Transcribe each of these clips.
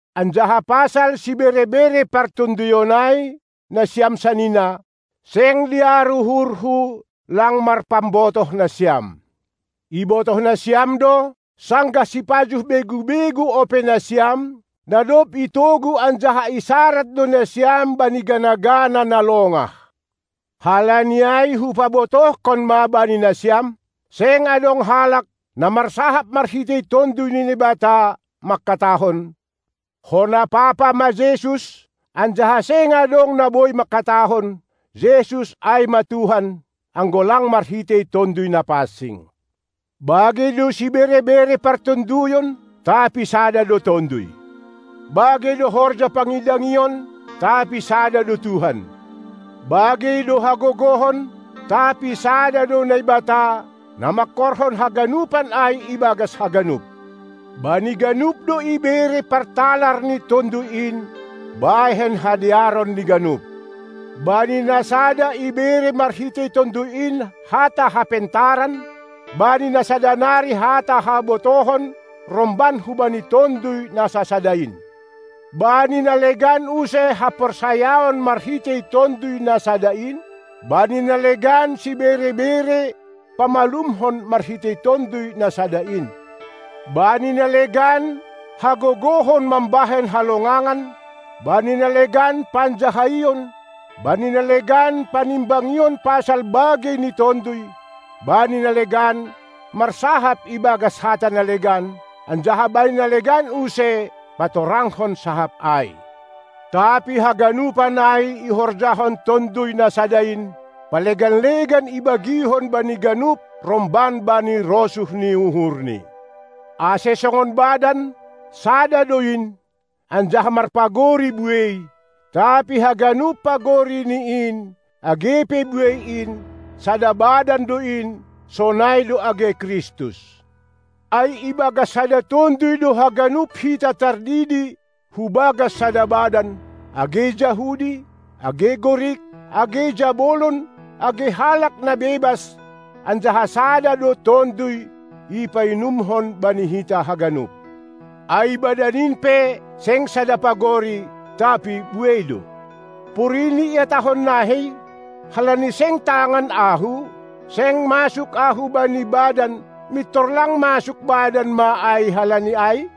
Anjaha pasal sibere-bere partonduyon ai, nasiam sanina, seng dear uhurhu lang marpambotoh nasiam. Ibotoh nasiam do, sanggah sipajuh begu-begu ope nasiam, na dob itogu anjaha isarad do nasiam bani gana-gana na longah. Halani ai hupabotohkon ma bani nasiam: Seng adong halak, na marsahap marhitei Tonduy ni Naibata mangkatahon: "Hona papa ma Jesus," anjaha seng adong na boi mangkatahon "Jesus ai ma Tuhan," anggo lang marhitei Tonduy Napansing. Bagei do sibere-bere partonduyon, tapi sada do Tonduy. Bagei do horja pangidangion, tapi sada do Tuhan. Bagei do hagogohon, tapi sada do Naibata, na mangkorhon haganupan ai ibagas haganup. Bani ganup do ibere partalar ni Tonduy in bahen hadearon ni ganup. Bani na sada ibere marhitei Tonduy in hata hapentaran, bani na sada nari hata habotohon romban hubani Tonduy na sasada in. Bani na legan use haporsayaon marhitei Tonduy na sada in, bani na legan sibere-bere pamalumhon marhitei Tonduy na sada in. Bani na legan hagogohon mambahen halongangan, bani na legan panjahaion, bani na legan panimbangion pasal bagei ni tonduy, bani na legan marsahap ibagas hata na legan, anjaha bani na legan use patorangkon sahap ai. Tapi haganupan ai ihorjahon Tonduy na sada in, palegan-legan ibagihon bani ganup romban bani rosuh ni uhurNi. Ai songon badan, sada do in, anjaha marpagori buei, tapi haganup pagorini in, age pe buei in, sada badan do in; sonai do age Kristus. Ai ibagas sada Tonduy do haganup hita tardidi hubagas sada badan, age Jahudi, age Gorik, age jabolon age halak na bebas, anjaha sada do Tonduy ipainumhon bani hita haganup. Ai badan in pe, seng sada pagori, tapi buei do. Porini ihatahon nahei: Halani seng tangan ahu, seng masuk ahu bani badan, mintor lang masuk badan ma ai halani ai?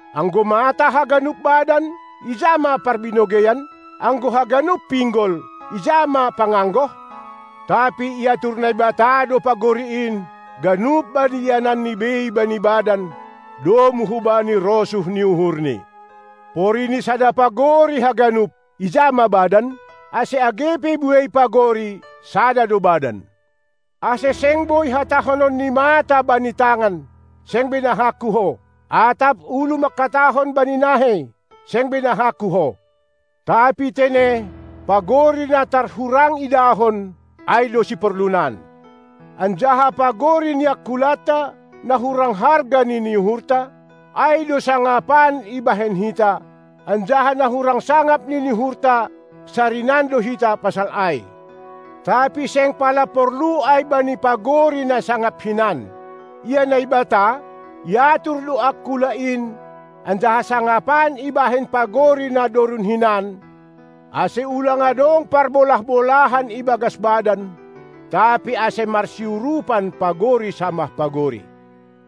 Anggo mata haganup badan, ija ma parbinogeian? Anggo haganup pinggol, ija ma panganggoh? Tapi iatur Naibata do pagori in, ganup bani iananni bei bani badan, domu hubani rosuh ni uhurNi. Porini sada pagori haganup, ija ma badan? Ase age pe buei pagori, sada do badan. Ase seng boi hatahonon ni mata bani tangan: "seng benahangku ho!"; atap ulu mangkatahon bani nahei: "Seng benahangku ho!" Tapi tene, pagori na tar hurang idahon, ai do siporlunan, anjaha pagori ni angkulanta, na hurang harga nini uhurta, ai do sangapan ibahen hita, anjaha na hurang sangap nini uhurta sarinan do hita pasal ai. Tapi seng pala porlu ai bani pagori na sangap hinan. Ia Naibata, iatur do angkula in, anjaha sangapan ibahen pagori na dorun hinan, ase ulang adong parbolah-bolahan ibagas badan, tapi ase marsiurupan pagori samah pagori.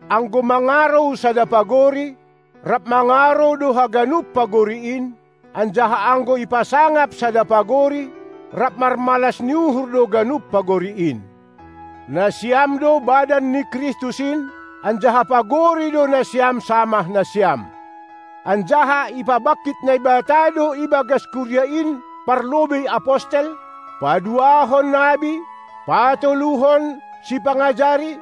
Anggo mangarou sada pagori, rap mangarou do haganup pagori in, anjaha anggo ipasangap sada pagori, rap marmalas ni uhur do ganup pagori in. Nasiam do badan ni Kristus in, anjaha pagori do nasiam samah nasiam. Anjaha ipabangkit Naibata do ibagas kuria in parlobei apostel, paduahon nabi, patoluhon sipangajari,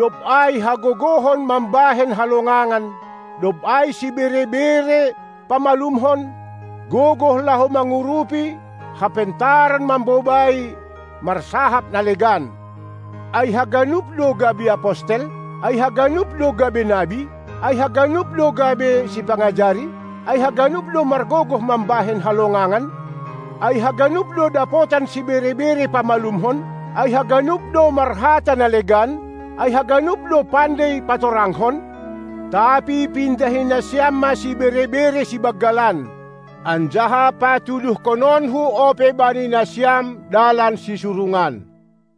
dob ai hagogohon mambahen halongangan, dob ai sibere-bere pamalumkon, gogoh laho mangurupi, hapentaran mambobai, marsahap na legan. Ai haganup do gabe apostel? Ai haganup do gabe nabi? Ai haganup do gabe sipangajari? Ai haganup do margogoh mambahen halongangan? Ai haganup do dapotan sibere-bere pamalumkon? Ai haganup do marhata na legan? Ai haganup do pandei patorangkon? Tapi pindahi nasiam ma sibere-bere sibanggalan. Anjaha patuduhononku ope bani nasiam dalan sisurungan.